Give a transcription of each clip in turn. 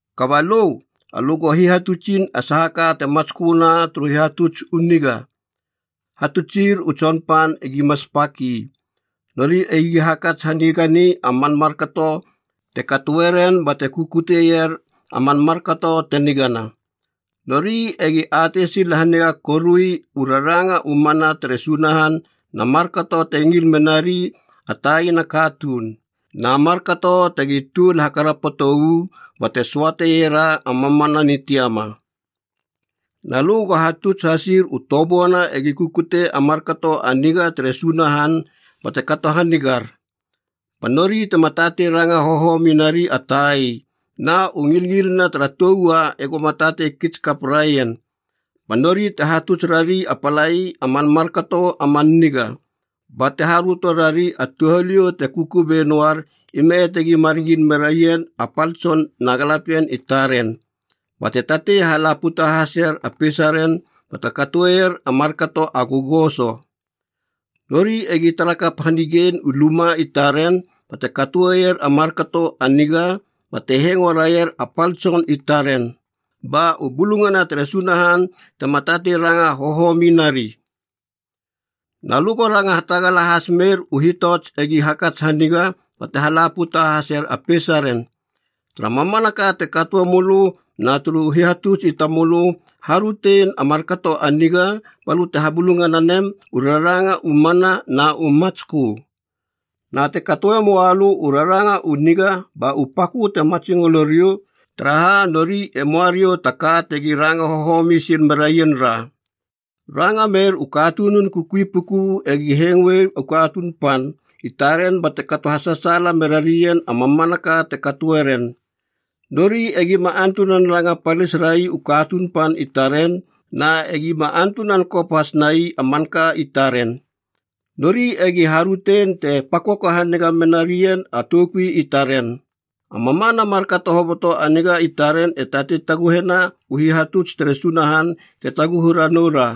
Kaba lö, alö go hihatutsin a saha ka te matsköna turu hihatuts u niga. Hatutsir u tsonpan egima spak ii, nori egi hakats hanigani a man markato te katoeren bate kukuteier a man markato te nigana. Nori egi atei sil haniga korui u raranga u mana tere Sunahan na markato te ngil menari a taina katuun, na markato tegi tuol hakarapoto uu bate söateiera a mamana nitiama. Na lö go hatuts hasir u toböana egi kukute a markato a niga tere Sunahan bate kato hanigar. Ba nori tema tatei ranga hohomi nari a tai, na u ngilngilina tara tou ua egoma tatei kits kap raien. Ba nori te hatuts rari a palai a man markato a man niga, bate haröto rari a touhaliou te kukubei noar, ime tegi mar ngil meraien a pal tson na galapien i taren, bate tatei hala puta haseier a peisaren bate katoeier a markato a gogoso. Nori egi tarakap hanigein u luma i taren, bate katoeier a markato a niga bate hengo raier a pal tson i taren, ba u bulungana tere Sunahan tema tatei ranga hohomi nari. Na lö go ranga hatagala has mer u hitots egi hakats haniga bate hala puta haseier a peisaren. Tara mamanaka te katoe mölö, na turu hihatuts i tamölö, harötein a markato a niga balö te habulungana nem u raranga u mana na u matskö. Na te katoe moa lö u raranga u niga ba u pakö te matsingolo riou, taraha nori e moa riou ta ka tegi ranga hohomi sil merien ra. Ranga mer u katunun kukui puku egi hengoer u katuun pan i taren bate kato hasasaala mera rien a mamanaka te katoe ren. Nori egima antunan ranga palis rai u katuun pan i taren, na egima antunan kop hasnai a manka i taren. Nori egi harötein te pakoko haniga mena rien a toukui i taren. A mamana markato hoboto a niga i taren e tatei taguhena u hihatuts tere Sunahan te taguhu ranou ra.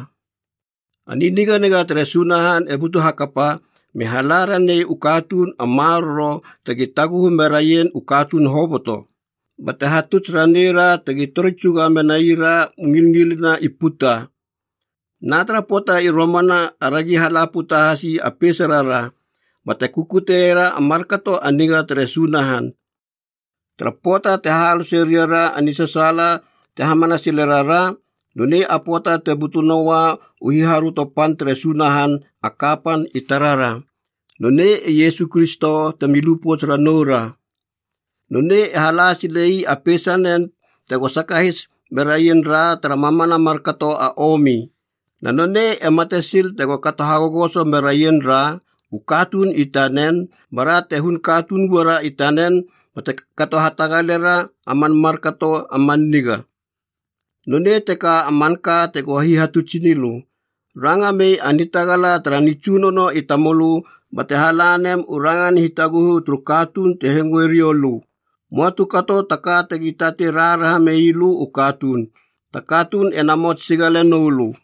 A niniganiga tere Sunahan e butu hakapa me hala ranei u katuun a maroro tegi taguhu meraien u katuun hoboto, bate hatuts raneira tegi tori tsuga menaira u ngilngilina i puta. Na tara pöata i romana aragi hala puta hasi a peisarara bate kukutera a markato a niga tere Sunahan. Tara pöata te hahalose riara a nisasaala te hamana sile rara, nonei a pöata te butu noua u hiharöto pan tere Sunahan a kapan i tarara, nonei e Iesu Kristo temi lu pouts ranou ra. Nonei e hala sile ii a peisanen tego sakahis meraien ra tara mamana markato a omi. Na nonei e mate sil tego kato hagogoso meraien ra, u katuun i tanen, bara te hun katuun uara i tanen bate kato hatagalera a man markato a man niga. Nonei teka a manka tego hihatutsinilö. Ranga mei a nitagala tara nitsunono i tamölö bate hala nem u rangan hitaguhu turu katuun te hengoe riou lö. Möa tu kato taka tegi tatei raharaha meilö u katuun. Ta katuun e namots sigale noulö.